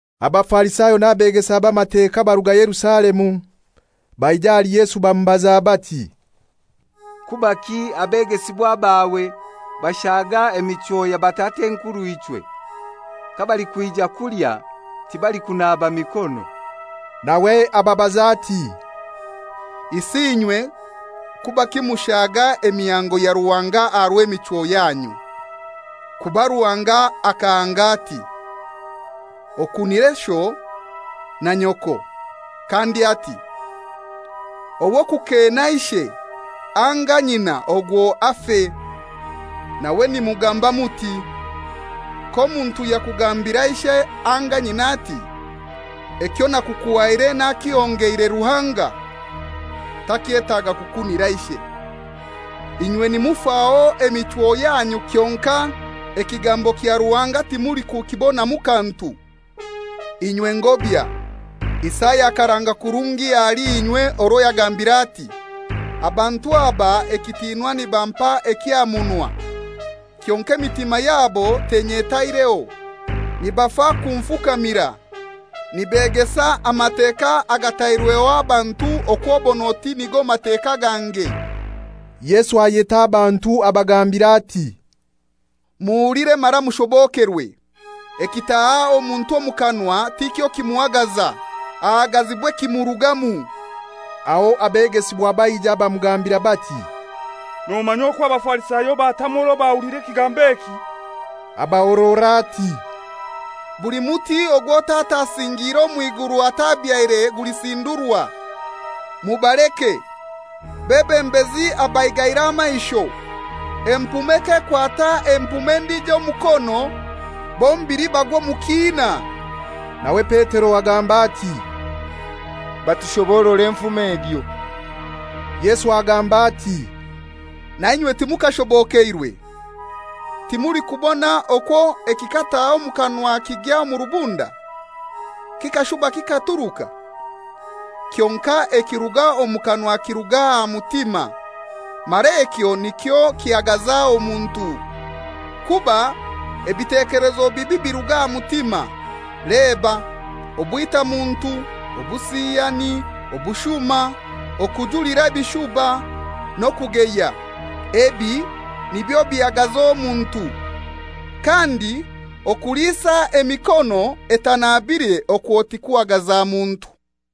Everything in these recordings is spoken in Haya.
Abafarisayo n'abegesa b'Amateka baruga Yerusalemu, baija ahali Yesu bamubaza bati, «Kubaki abegesibwa bawe bashaga emichwo ya batat'enkurw'ichwe? Kabalikwija kulya tibalikunaba mikono.» Nawe ababaza ati, «Isi inywe kubaki mushaaga emihango ya Ruhanga aha rw'emichwo yanyu? Kuba Ruhanga akahanga ati, ‹Okunire sho na nyoko,› kandi ati, ‹Ow'okukeena ishe anga nyina ogwo afe.› Nawe nimugamba muti, ‹K'omuntu yakugambira ishe anga nyina ati: Ekyo nakukuhaire nakihongeire Ruhanga, takyetaga kukunira ishe.› Inywe nimufaho emichwo yanyu kyonkai ekigambo kya Ruhanga timulikukibonamu kantu. Inywe ngobya! Isaya akaranga kurungi ahali inywe orwo yagambire ati, ‹Abantu aba ekitinwa nibampa eky'aha munwa, kyonkai emitima yabo tenyetaireho. Nibafa kunfukamira, nibegesa Amateka agatairweho abantu okw'obon'oti nigo Mateka gange.›» Yesu ayeta abantu abagambira ati, «Muhulire mara mushobokerwe: Ekitaha omuntu omu kanwa ti kyo kimuhagaza, ahagazibwa ekimurugamu.» Aho abegesibwa baija bamugambira bati, «Nomanya okwo Abafarisayo batamwa orwo bahulira ekigambo eki?» Abahorora ati, «Buli muti ogwo Tata asingiire omw'iguru atabyaire gulisindurwa. Mubaleke; bebembezi abaigaire amaisho. Empume k'ekwata empume endijo omukono, bombili bagwa omu kiina.» Nawe Petero agamba ati, «Batushoborore enfumo egyo.» Yesu agamba ati, «Nainywe timukashobokeirwe? Timulikubona okwo ekikataha omu kanwa kigya omu rubunda, kikashuba kikaturuka? Kyonkai ekiruga omu kanwa kiruga aha mutima, mara ekyo nikyo kihagaza omuntu. Kuba ebitekelezo bibi biruga aha mutima, leba: obwitamuntu, obusiyani, obushuma, okujulira ebishuba, n'okugeya. Ebi nibyo bihagaza omuntu. Kandi okuliisa emikono etanabire okwo tikuhagaza muntu.»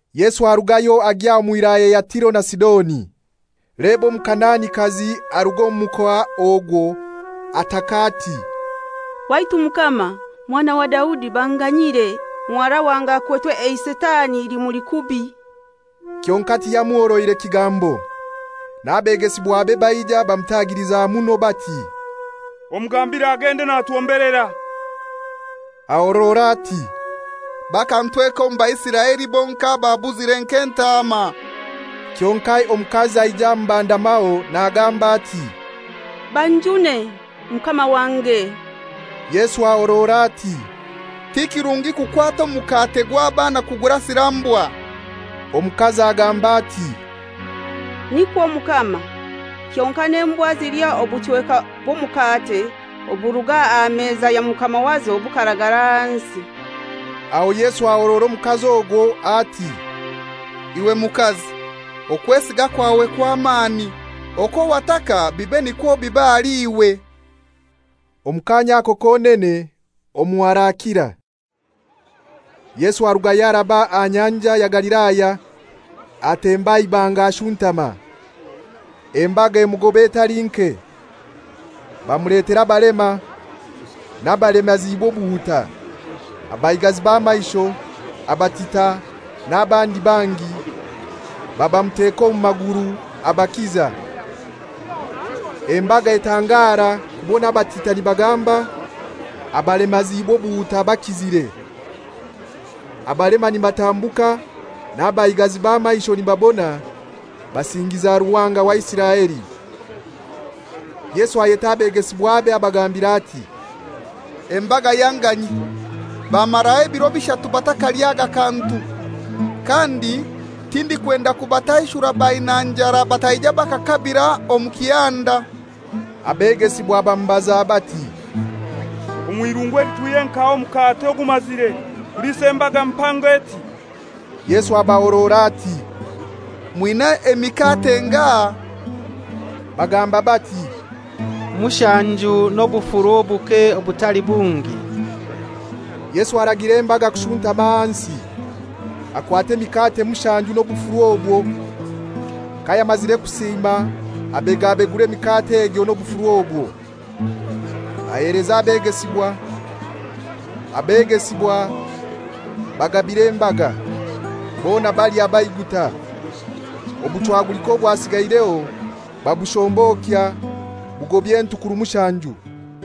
Yesu arugayo agya omu wilaya ya Tiro na Sidoni. Leba Omukanaanikazi aruga omu mukoa ogwo ataka, ati, «Waitu Mukama, Mwana wa Daudi banganyire; muhara wange akwetwe eisitani, limuli kubi.» Kyonkai tiyamuhoroire kigambo. N'abegesibwabe baija bamutagiliza muno bati, «Omugambire agende, natwombelera.» Ahorora ati, «Bakantweka omu Baisiraeli bonkai ababuzire nk'entaama.» Kyonkai omukazi aija amubandamaho nagamba ati, «Banjune, Mukama wange.» Yesu ahorora ati, «Ti kirungi kukwata mukate gwa baana kugurasira mbwa.» Omukazi agamba ati, «Nikwo Mukama, kyonkai n'embwa zilya obuchweka bw'omukate oburuga aha meza ya mukama wazo bukaragara ahansi.» Aho Yesu ahorora omukazi ogwo ati, «Iwe mukazi, okwesiga kwawe kw'amani! Okwo wataka bibe nikwo biba ahali iwe.» Omu kaanya ako konene omuhara akira. Yesu arugayo araba aha Nyanja ya Galilaya. Atemba aha ibanga ashuntama. Embaga emugoba etali nke, bamuletera abalema, n'abalemaziibwe obuhuta, abaigazi b'amaisho, abatita, n'abandi bangi, babamuteka omu maguru, abakiza. Embaga etangara kubona abatita nibagamba, abalemaziibwe obuhuta bakizire, abalema nibatambuka n'abaigazi b'amaisho nibabona Basingiza Ruhanga wa Isiraeli. Yesu ayeta abegesibwabe abagambira ati, «Embaga yanganyia. Bamaraho ebiro bishatu batakalyaga kantu. Kandi tindikwenda kubataishura baina njara bataija bakakabira omu kihanda.» Abegesibwa bamubaza bati, «Omw'irungu eli twihye nkahai omukate ogumazire kuliisa embaga mpango eti?» Yesu abahorora ati, «Mwina emikate engahai?» Bagamba bati, «Mushanju n'obufuru obuke obutali bungi.» Yesu aragira embaga kushuntama ahansi. Akwata emikate mushanju n'obufuru obwo, kayamazire kusiima abegabegura emikate egyo n'obufuru obwo, aheleza abegesibwa, abegesibwa bagabira embaga. Bona balya baiguta. Obuchwagulika obwasigaireho babushombokya bugobya entukuru mushanju.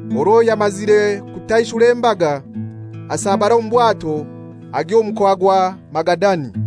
Orwo yamazire kutaishura embaga, asabara omu bwato agya omu mukoa gwa Magadani.